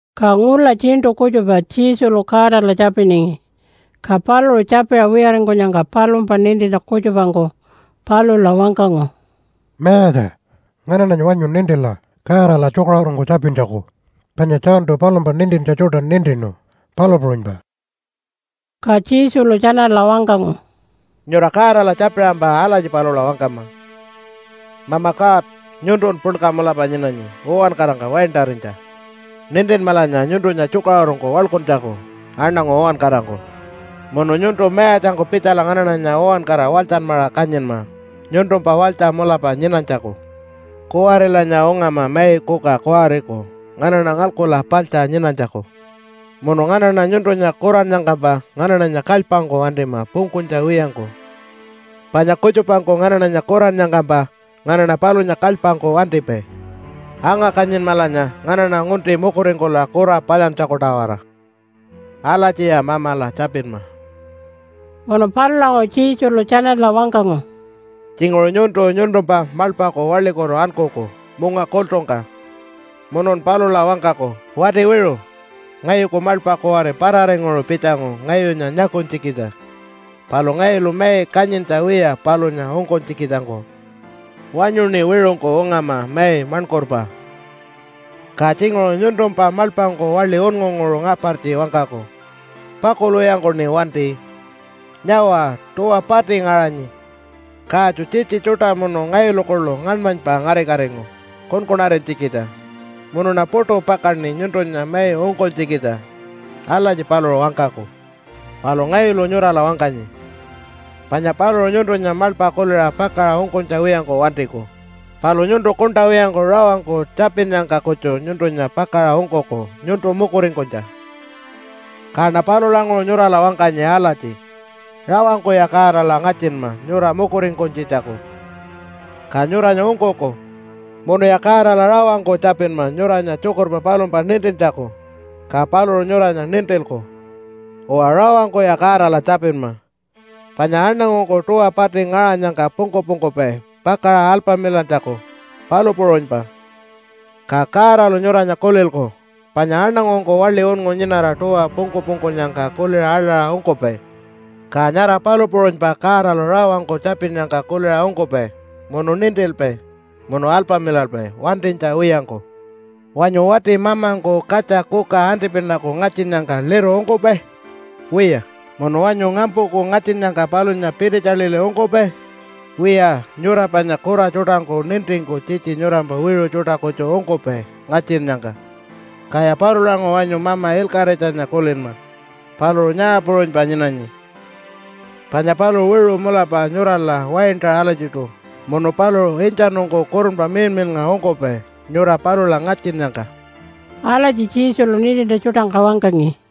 Ka ngula tjiṉṯu kutjupa Jesulu Godala tjapiningi. Ka paluṟu tjapiṟa wiyaringkunyangka palumpa nintintja kutjupangku palula wangkangu, “Mayatja, nganaṉanya wanyu nintila Godala tjukaṟurungku tjapintjaku. Panya Johntu palumpa nintintja tjuṯa nintinu, palu puṟunypa.” Ka Jesulu tjanala wangkangu, “Nyura Godala tjapiṟampa alatji palula wangkama, ‘Mama God, nyuntun puḻka mulapa nyinanyi uwankarangka waintarinytja. Nintinmalanya nyuntunya tjukaṟurungku waḻkuntjaku aṉangu uwankarangku. Munu nyuntu mayatjangku pitjala nganaṉanya uwankara walytjanmaṟa kanyinma nyuntumpa walytja mulapa nyinanytjaku. Kuwarilanya ungama mai kuka kuwariku nganaṉa ngalkula paḻtja nyinanytjaku. Munu nganaṉa nyuntunya kurannyangkampa nganaṉanya kalypangku wantima pungkunytja wiyangku. Panya kutjupangku nganaṉanya kurannyangkampa nganaṉa palunya kalypangku wantipai. Anga-kanyinmalanya nganaṉa ngunti mukuringkula kura palyantjaku-tawara.’ Alatjiya Mamala tjapinma.” Munu palulanguṟu Jesulu tjanala wangkangu, “Tjinguṟu nyuntu nyuntumpa maḻpaku waḻikutu ankuku munga kultungka munun palula wangkaku, ‘Wati wiṟu! Ngayuku maḻpa kuwari pararinguṟu pitjangu ngayunya nyakunytjikitja. Palu ngayulu mai kanyintja wiya palunya ungkunytjikitjangku. Wanyuṉi wiṟungku ungama mai maṉkurpa.’ “Ka tjinguṟu nyuntumpa maḻpangku waḻi unngunguṟu ngapartji wangkaku, ‘Pakulwiyangkuṉi wanti! Nyawa, tuwa pati ngaṟanyi. Katju tjitji tjuṯa munu ngayulu kuḻu ngaṉmanypa ngarikatingu kunkunarinytjikitja, munuṉa puṯu pakaṉi nyuntunya mai ungkunytjikitja.’ Alatji paluṟu wangkaku. Palu ngayulu nyurala wangkanyi, panya paluṟu nyuntunya maḻpa kuliṟa pakaṟa ungkunytja wiyangku wantiku, palu nyuntu kuṉṯa wiyangku rawangku tjapinnyangka kutju nyuntunya pakaṟa ungkuku nyuntu mukuringkunytja. “Kaṉa palulanguṟu nyurala wangkanyi alatji rawangkuya Godala ngatjinma nyura mukuringkunytjitjaku, ka nyuranya ungkuku. Munuya Godala rawangku tjapinma nyuranya tjukurpa palumpa nintintjaku, ka paluṟu nyuranya nintilku. Uwa, rawangkuya Godala tjapinma, panya aṉangungku tuwa pati ngaṟanyangka pungku-pungkupai pakaṟa alpamilantjaku, palu puṟunypa. Ka Godalu nyuranya kulilku, panya aṉangungku waḻi unngu nyinara tuwa pungku-pungkunyangka kuliṟa aḻaṟa ungkupai, ka nyara palu puṟunypa Godalu rawangku tjapinnyangka kuliṟa ungkupai munu nintilpai munu alpamilalpai wantinytja wiyangku. Wanyu wati mamangku katja kuka antipinaku ngatjinnyangka liru ungkupai? Wiya! Munu wanyu ngampuku ngatjinnyangka palunya pititjaḻiḻi ungkupai? Wiya, nyura panya kura tjuṯangku nintingku tjitji nyurampa wiṟu tjuṯa kutju ungkupai ngatjinnyangka. Kaya palulanguṟu wanyu Mama Ilkaṟitjanya kulinma, paluṟu nyaa puṟunypa nyinanyi? Panya paluṟu wiṟu mulapa nyurala waintaṟa alatjiṯu munu paluṟu intjanungku Kurunpa Miḻmiḻnga ungkupai nyura palula ngatjinnyangka.” Alatji Jesulu nintintja tjuṯangka wangkangi.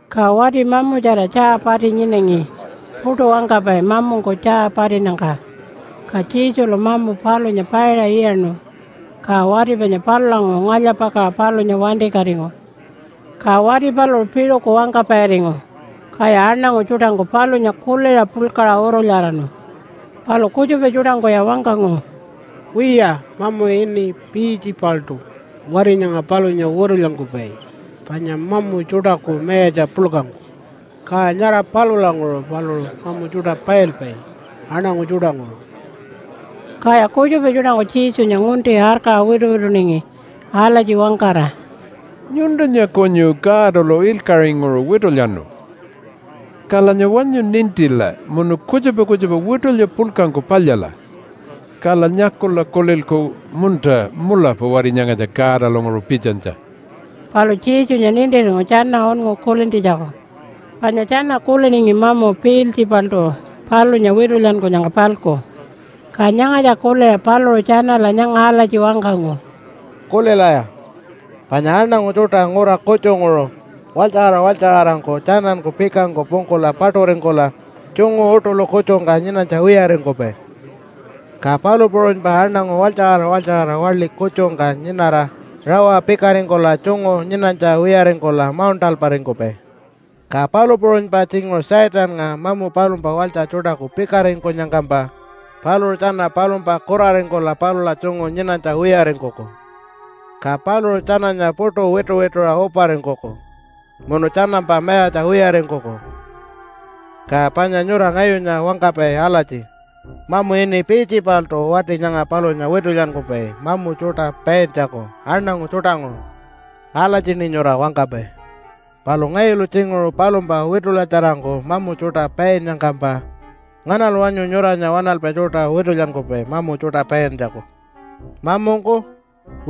Ka wati mamutjara tjaa pati nyinangi puṯu wangkapai mamungku tjaa patinnyangka. Ka Jesulu mamu palunya paiṟa iyaṉu, ka wati panya palulanguṟu ngalya-pakaṟa palunya wantikatingu. Ka wati paluṟu piṟuku wangkapairingu, kaya aṉangu tjuṯangku palunya kuliṟa puḻkaṟa urulyaraṉu. Palu kutjupa tjuṯangkuya wangkangu, “Wiya, mamu ini Piiltjipaltu wati nyanga palunya witulyankupai panya mamu tjuṯaku mayatja puḻkangku, ka nyara palulanguṟu paluṟu mamu tjuṯa pailpai aṉangu tjuṯanguṟu.” Kaya kutjupa tjuṯangku Jesunya ngunti arkaṟa wituwituningi alatji wangkara, “Nyuntunya kunyu Godalu ilkaṟinguṟu witulyanu. Kalanya wanyu nintila munu kutjupa kutjupa witulya puḻkangku palyala, kala nyakula kulilku, ‘Munta, mulapa wati nyangatja Godalanguṟu pitjanytja.’” Palu Jesunya nintiringu tjana unngu kulintjitjaku, panya tjana kuliningi mamu Piiltjipaltu palunya witulyankunyangka-palku. Ka nyangatja kuliṟa paluṟu tjanala nyanga alatji wangkangu, “Kulilaya! Panya aṉangu tjuṯa ngura kutjunguṟu, walytjaṟara walytjaṟarangku tjananku pikangku pungkula paṯuringkula, tjungu uṯuḻu kutjungka nyinanytja wiyaringkupai. Ka palu puṟunypa aṉangu walytjaṟara walytjaṟara waḻi kutjungka nyinara, rawa pikaringkula tjungu nyinanytja wiyaringkula mauṉṯalparingkupai. Ka palu puṟunypa tjinguṟu Satannga mamu palumpa walytja tjuṯaku pikaringkunyangkampa, paluṟu tjana palumpa kuraringkula palula tjungu nyinanytja wiyaringkuku, ka paluṟu tjananya puṯu wituwituṟa uparingkuku, munu tjanampa mayatja wiyaringkuku. Ka panya nyura ngayunya wangkapai alatji, ‘Mamu ini Piiltjipaltu wati nyanga palunya witulyankupai mamu tjuṯa paintjaku aṉangu tjuṯanguṟu.’ Alatjiṉi nyura wangkapai. Palu ngayulu tjinguṟu palumpa witulyatjarangku mamu tjuṯa painnyangkampa, nganalu wanyu nyuranya waṉalpai tjuṯa witulyankupai mamu tjuṯa paintjaku? Mamungku?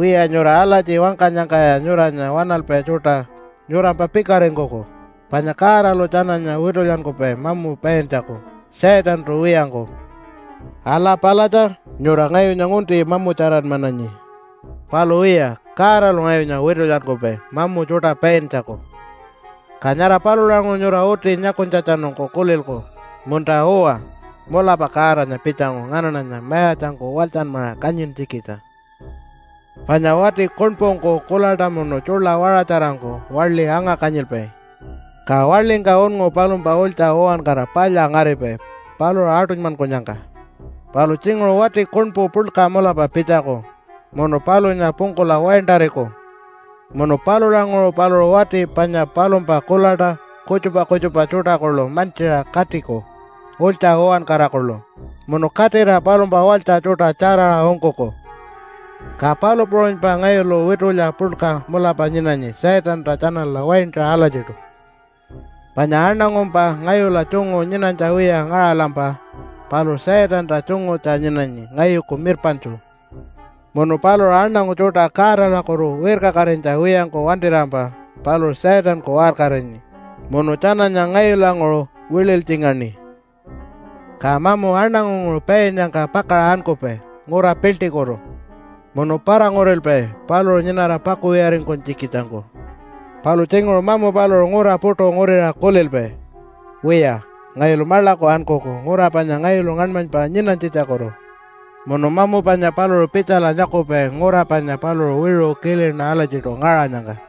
Wiya, nyura alatji wangkanyangkaya nyuranya waṉalpai tjuṯa nyurampa pikaringkuku, panya Godalu tjananya witulyankupai mamu paintjaku Satantu wiyangku. Ala palatja! Nyura ngayunya ngunti mamutjaranmananyi. Palu wiya, Godalu ngayunya witulyankupai mamu tjuṯa paintjaku, ka nyara palulanguṟu nyura uti nyakunytjatjanungku kulilku, ‘Munta-uwa, mulapa Godanya pitjangu nganaṉanya mayatjangku walytjanmaṟa kanyintjikitja.’ “Panya wati kuṉpungku kuḻaṯa munu tjuḻa waṟatjarangku waḻi anga-kanyilpai, ka waḻingka unngu palumpa ulytja uwankara palya ngaripai paluṟu aṯunymankunyangka. Palu tjinguṟu wati kuṉpu puḻka mulapa pitjaku munu palunya pungkula waintariku. Munu palulanguṟu paluṟu wati panya palumpa kuḻaṯa, kutjupa kutjupa tjuṯa kuḻu mantjiṟa katiku ulytja uwankara kuḻu, munu katira palumpa walytja tjuṯa tjaraṟa ungkuku. Ka palu puṟunypa ngayulu witulya puḻka mulapa nyinanyi Satanta tjanala waintaṟa alatjiṯu. “Panya aṉangumpa ngayula tjungu nyinanytja wiya ngaṟalampa paluṟu Satanta tjungutja nyinanyi ngayuku mirpaṉtju. Munu paluṟu aṉangu tjuṯa Godalakutu wirkakatinytja wiyangku wantirampa paluṟu Satanku waṟkarinyi munu tjananya ngayulanguṟu wililytjingaṉi. “Ka mamu aṉangunguṟu painnyangka pakaṟa ankupai ngura piḻṯikutu munu para-ngurilpai paluṟu nyinara pakuwiyaringkunytjikitjangku. Palu tjinguṟu mamu paluṟu ngura puṯu nguriṟa kulilpai, ‘Wiya, ngayulu maḻaku ankuku ngura panya ngayulu ngaṉmanypa nyinanytjitjakutu.’ Munu mamu panya paluṟu pitjala nyakupai ngura panya paluṟu wiṟu kilina alatjiṯu ngaṟanyangka.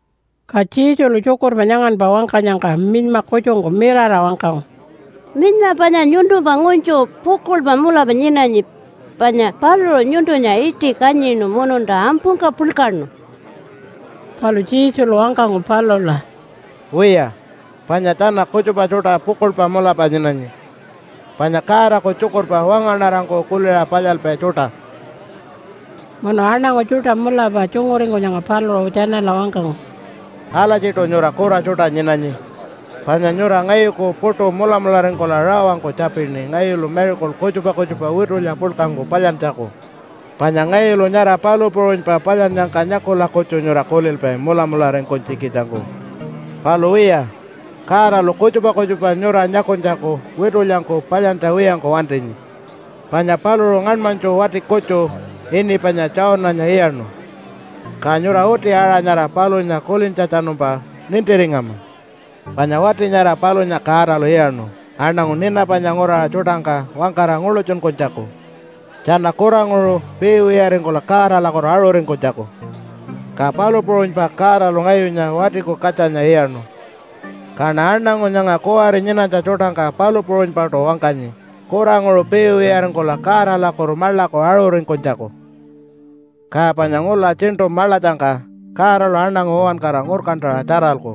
Ka Jesulu tjukurpa nyanganpa wangkanyangka minyma kutjungku mirara wangkangu, “Minyma panya nyuntumpa ngunytju pukuḻpa mulapa nyinanyi, panya paluṟu nyuntunya iṯi kanyinu mununta ampungka puḻkaṉu.” Palu Jesulu wangkangu palula, “Wiya, panya tjana kutjupa tjuṯa pukuḻpa mulapa nyinanyi, panya Godaku tjukurpa wangaṉarangku kuliṟa palyalpai tjuṯa.” Munu aṉangu tjuṯa mulapa tjunguringkunyangka paluṟu tjanala wangkangu, “Alatjiṯu nyura kura tjuṯa nyinanyi, panya nyura ngayuku puṯu mulamularingkula rawangku tjapini ngayulu miracle kutjupa kutjupa witulya puḻkangku palyantjaku, panya ngayulu nyara palu puṟunypa palyannyangka nyakula kutju nyura kulilpai mulamularingkunytjikitjangku. Palu wiya, Godalu kutjupa kutjupa nyura nyakunytjaku witulyangku palyantja wiyangku wantinyi, panya paluṟu ngaṉmanytju wati kutju ini panya Jonah-nya iyaṉu, ka nyura uti aṟa nyara palunya kulintjatjanumpa nintiringama. Panya wati nyara palunya Godalu iyaṉu aṉangu Ninapanya nguraṟa tjuṯangka wangkara nguḻutjunkunytjaku, tjana kuranguṟu piiwiyaringkula Godalakutu aṟuringkunytjaku. Ka palu puṟunypa Godalu ngayunya Watiku Katjanya iyaṉu, kaṉa aṉangu nyanga kuwari nyinanytja tjuṯangka palu puṟunypaṯu wangkanyi kuranguṟu piiwiyaringkula Godalakutu maḻaku aṟuringkunytjaku. “Ka panya ngula tjiṉṯu maḻatjangka Godalu aṉangu uwankara ngurkantaṟa tjaralku,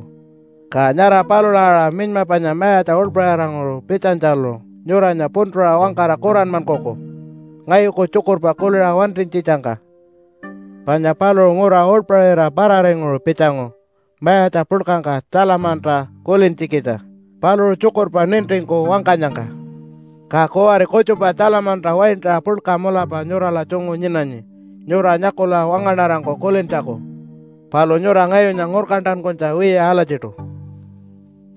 ka nyara palula aṟa minyma panya mayatja uḻpaṟiranguṟu pitjanytjalu nyuranya puntuṟa wangkara kuranmankuku ngayuku tjukurpa kuliṟa wantinytjitjangka. Panya paluṟu ngura uḻpaṟira pararinguṟu pitjangu mayatja puḻkangka Tjalamanta kulintjikitja paluṟu tjukurpa nintingku wangkanyangka. Ka kuwari kutjupa Tjalamanta waintaṟa puḻka mulapa nyurala tjungu nyinanyi nyura nyakula wangaṉarangku kulintjaku. Palu nyura ngayunya ngurkantankunytja wiya alatjiṯu.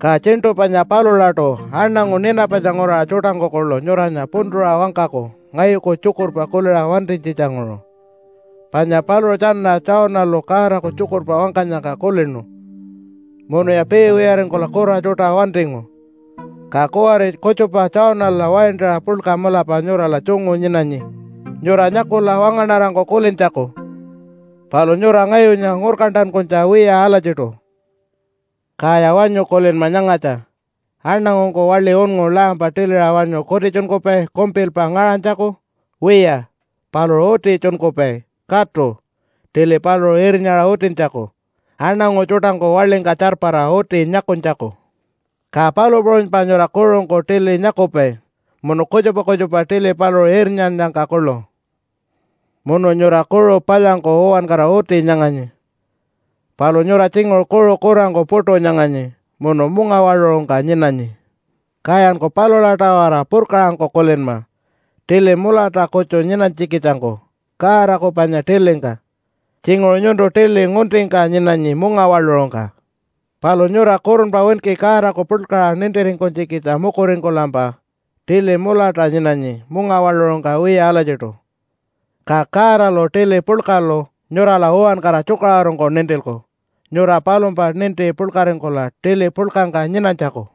“Ka tjiṉṯu panya palulaṯu aṉangu Ninapanya nguraṟa tjuṯangku kuḻu nyuranya puntuṟa wangkaku ngayuku tjukurpa kuliṟa wantinytjitjanguṟu. Panya paluṟu tjana Jonah-lu Godaku tjukurpa wangkanyangka kulinu munuya piiwiyaringkula kura tjuṯa wantingu. Ka kuwari kutjupa Jonah-la waintaṟa puḻka mulapa nyurala tjungu nyinanyi nyura nyakula wangaṉarangku kulintjaku. Palu nyura ngayunya ngurkantankunytja wiya alatjiṯu. “Kaya wanyu kulinma nyangatja. Aṉangungku waḻi unngu lampa tiliṟa wanyu kutitjunkupai kumpilpa ngaṟanytjaku? Wiya, paluṟu uti tjunkupai, katu, tili paluṟu irnyaṟa utintjaku aṉangu tjuṯangku waḻingka tjarpara uti nyakunytjaku. Ka palu puṟunypa nyura kuṟungku tili nyakupai munu kutjupa kutjupa tili paluṟu irnyannyangka kuḻu. “Munu nyura kuṟu palyangku uwankara uti nyanganyi. Palu nyura tjinguṟu kuṟu kurangku puṯu nyanganyi munu mungawaḻuṟungka nyinanyi. Kayanku palula-tawara purkaṟangku kulinma tili mulata kutju nyinanytjikitjangku Godaku panya tilingka. Tjinguṟu nyuntu tili nguntingka nyinanyi mungawaḻuṟungka. Palu nyura kurunpa winki Godaku puḻkaṟa nintiringkunytjikitja mukuringkulampa tili mulata nyinanyi mungawaḻuṟungka wiya alatjiṯu, ka Godalu tili puḻkalu nyurala uwankara tjukaṟurungku nintilku nyura palumpa ninti puḻkaringkula tili puḻkangka nyinanytjaku.”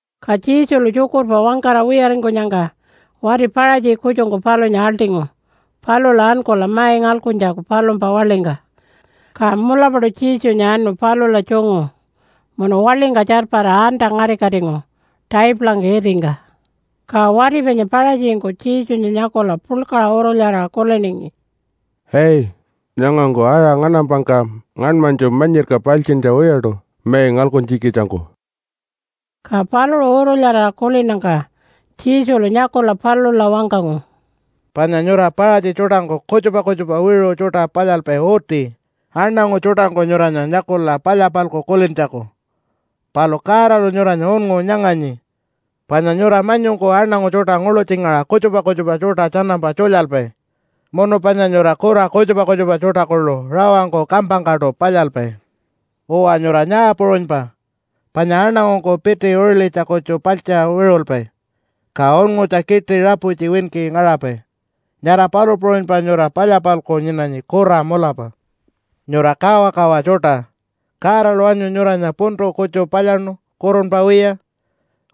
Ka Jesulu tjukurpa wangkara wiyaringkunyangka wati Paṟatji kutjungku palunya aḻṯingu palula ankula mai ngalkuntjaku palumpa waḻingka. Ka mulapaṯu Jesunya anu palula tjungu munu waḻingka tjarpara anta-ngarikatingu taipulangka itingka. Ka wati panya Paṟatjingku Jesunya nyakula puḻkaṟa urulyaraṟa kuliningi, “Ai, nyangangku aṟa nganampangka ngaṉmanytju manyirka paltjintja wiyaṯu mai ngalkuntjikitjangku.” Ka paluṟu urulyaraṟa kulinnyangka Jesulu nyakula palula wangkangu, “Panya nyura Paṟatji tjuṯangku kutjupa kutjupa wiṟu tjuṯa palyalpai uti, aṉangu tjuṯangku nyuranya nyakula palya-palku kulintjaku. Palu Godalu nyuranya unngu nyanganyi, panya nyura manyungku aṉangu tjuṯa nguḻutjingaṟa kutjupa kutjupa tjuṯa tjanampa tjulyalpai, munu panya nyura kura kutjupa kutjupa tjuṯa kuḻu rawangku kampangkaṯu palyalpai. Uwa, nyura nyaa puṟunypa, panya aṉangungku piti uṟilitja kutju paltjiṟa wiṟulpai, ka unngutja kiṯi raputji winki ngaṟapai, nyara palu puṟunypa nyura palya-palku nyinanyi kura mulapa. Nyura kawakawa tjuṯa! Godalu wanyu nyuranya puntu kutju palyaṉu kurunpa wiya?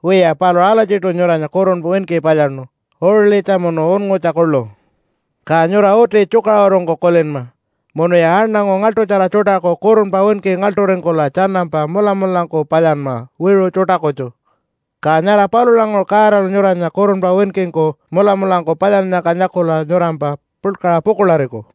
Wiya, paluṟu alatjiṯu nyuranya kurunpa winki palyaṉu, uṟilitja munu unngutja kuḻu. Ka nyura uti tjukaṟurungku kulinma munuya aṉangu ngaḻṯutjara tjuṯaku kurunpa winki ngaḻṯuringkula tjanampa mulamulangku palyanma wiṟu tjuṯa kutju, ka nyara palulanguṟu Godalu nyuranya kurunpa winkingku mulamulangku palyannyangka nyakula nyurampa puḻkaṟa pukuḻariku.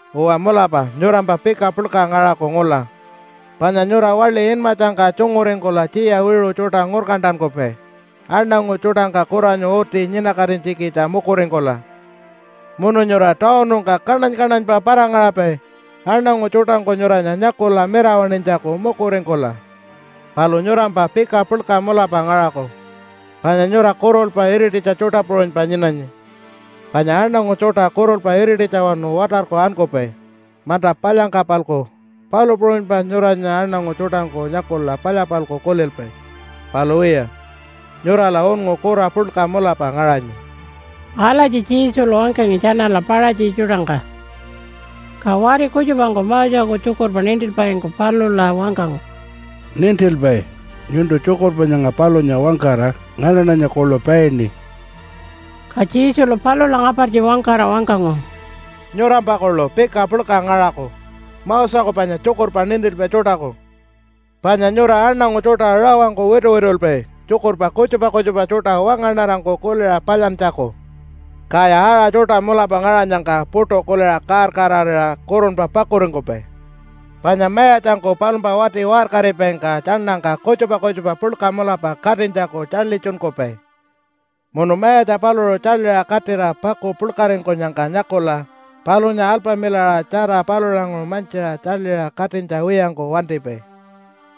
“Uwa, mulapa nyurampa pika puḻka ngaṟaku ngula, panya nyura waḻi inmatjangka tjunguringkula tjiya wiṟu tjuṯa ngurkantankupai aṉangu tjuṯangka kuranyu uti nyinakatinytjikitja mukuringkula. Munu nyura tawunungka kaṉany-kaṉanypa para-ngaṟapai aṉangu tjuṯangku nyuranya nyakula mirawaṉinytjaku mukuringkula. Palu nyurampa pika puḻka mulapa ngaṟaku, panya nyura kurulpa irititja tjuṯa puṟunypa nyinanyi. Panya aṉangu tjuṯa kurulpa irititjawanu watarku ankupai manta palyangka-palku, palu puṟunypa nyuranya aṉangu tjuṯangku nyakula palya-palku kulilpai, palu wiya nyurala unngu kura puḻka mulapa ngaṟanyi.” Alatji Jesulu wangkangi tjanala Paṟatji tjuṯangka. Ka wati kutjupangku Moseku tjukurpa nintilpaingku palula wangkangu, “Nintilpai, nyuntu tjukurpa nyanga palunya wangkara nganaṉanya kuḻu paini.” Ka Jesulu palula ngapartji wangkara wangkangu, “Nyurampa kuḻu pika puḻka ngaṟaku Moseku panya tjukurpa nintilpai tjuṯaku, panya nyura aṉangu tjuṯa rawangku wituwitulpai tjukurpa kutjupa kutjupa tjuṯa wangaṉarangku kuliṟa palyantjaku, kaya aṟa tjuṯa mulapa ngaṟanyangka puṯu kuliṟa kaar-kaararira kurunpa pakuringkupai. Panya mayatjangku palumpa wati waṟkaripaingka tjaṉangka kutjupa kutjupa puḻka mulapa katinytjaku tjaḻitjunkupai munu mayatja paluṟu tjaḻiṟa katira paku puḻkaringkunyangka nyakula, palunya alpamilaṟa tjara palulanguṟu mantjiṟa tjaḻiṟa katinytja wiyangku wantipai.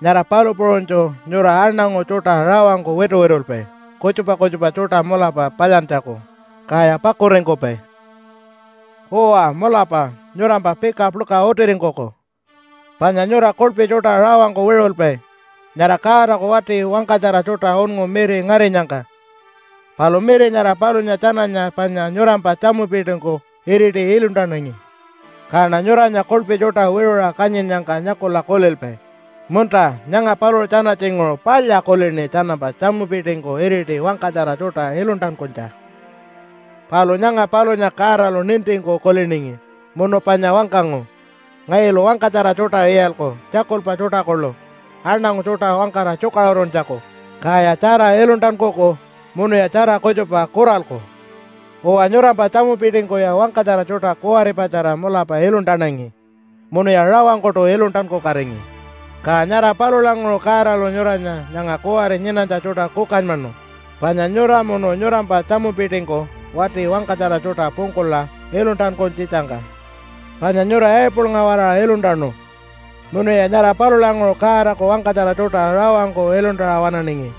Nyara palu puṟunytju nyura aṉangu tjuṯa rawangku wituwitulpai kutjupa kutjupa tjuṯa mulapa palyantjaku, kaya pakuringkupai. “Uwa, mulapa nyurampa pika puḻka utiringkuku, panya nyura kuḻpi tjuṯa rawangku wiṟulpai nyara Godaku wati wangkatjara tjuṯa unngu miri ngarinyangka. Palu miri nyara palunya tjananya panya nyurampa tjamupitingku iriti iluntanangi. Kaṉa nyuranya kuḻpi tjuṯa wiṟuṟa kanyinnyangka nyakula kulilpai, ‘Munta, nyanga paluṟu tjana tjinguṟu palya kulini tjanampa tjamupitingku iriti wangkatjara tjuṯa iluntankunytja.’ “Palu nyanga palunya Godalu nintingku kuliningi munu panya wangkangu, ‘Ngayulu wangkatjara tjuṯa iyalku, tjakulpa tjuṯa kuḻu aṉangu tjuṯa wangkara tjukaṟuruntjaku. Kaya tjara iluntankuku munuya tjara kutjupa kuralku.’ Uwa, nyurampa tjamupitingkuya wangkatjara tjuṯa kuwaripatjara mulapa iluntanangi, munuya rawangkuṯu iluntankukatingi. Ka nyara palulanguṟu Godalu nyuranya nyanga kuwari nyinanytja tjuṯa kukanymanu, panya nyura munu nyurampa tjamupitingku wati wangkatjara tjuṯa pungkula iluntankunytjitjangka. Panya nyura Abelnga-waraṟa iluntanu, munuya nyara palulanguṟu Godaku wangkatjara tjuṯa rawangku iluntaṟa waṉaningi,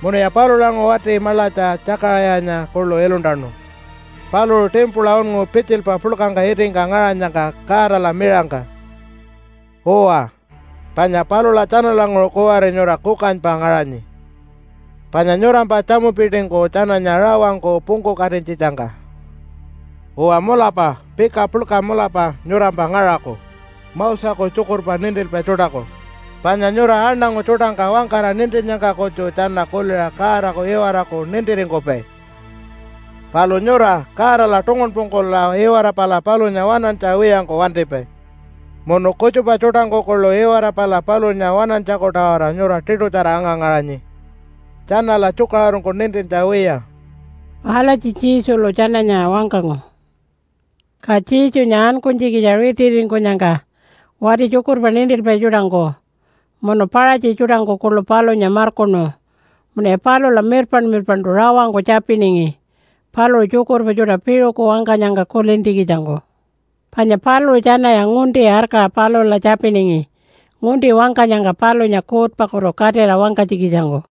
munuya palulanguṟu wati maḻatja Tjakaṟayanya kuḻu iluntanu, paluṟu timpula unngu pitjilpa puḻkangka itingka ngaṟanyangka, Godala miṟangka. Uwa, panya palula tjanalanguṟu kuwari nyura kukanypa ngaṟanyi, panya nyurampa tjamupitingku tjananya rawangku pungkukatinytjitjangka. “Uwa mulapa pika puḻka mulapa nyurampa ngaṟaku Moseku tjukurpa nintilpai tjuṯaku. Panya nyura aṉangu tjuṯangka wangkara nintinnyangka kutju tjana kuliṟa Godaku iwaraku nintiringkupai, palu nyura Godala tungunpungkula iwara pala palunya waṉantja wiyangku wantipai, munu kutjupa tjuṯangku kuḻu iwara pala palunya waṉantjaku-tawara nyura tiṯutjara anga-ngaṟanyi, tjanala tjukaṟurungku nintintja wiya.” Alatji Jesulu tjananya wangkangu. Ka Jesunya ankunytjikitja ritiringkunyangka wati tjukurpa nintilpai tjuṯangku munu Paṟatji tjuṯangku kuḻu palunya markuṉu munuya palula mirpaṉ-mirpaṉṯu rawangku tjapiningi paluṟu tjukurpa tjuṯa piṟuku wangkanyangka kulintjikitjangku. Panya paluṟu tjanaya ngunti arkaṟa palula tjapiningi ngunti wangkanyangka palunya kuutpakutu katira wangkanytjikitjangku.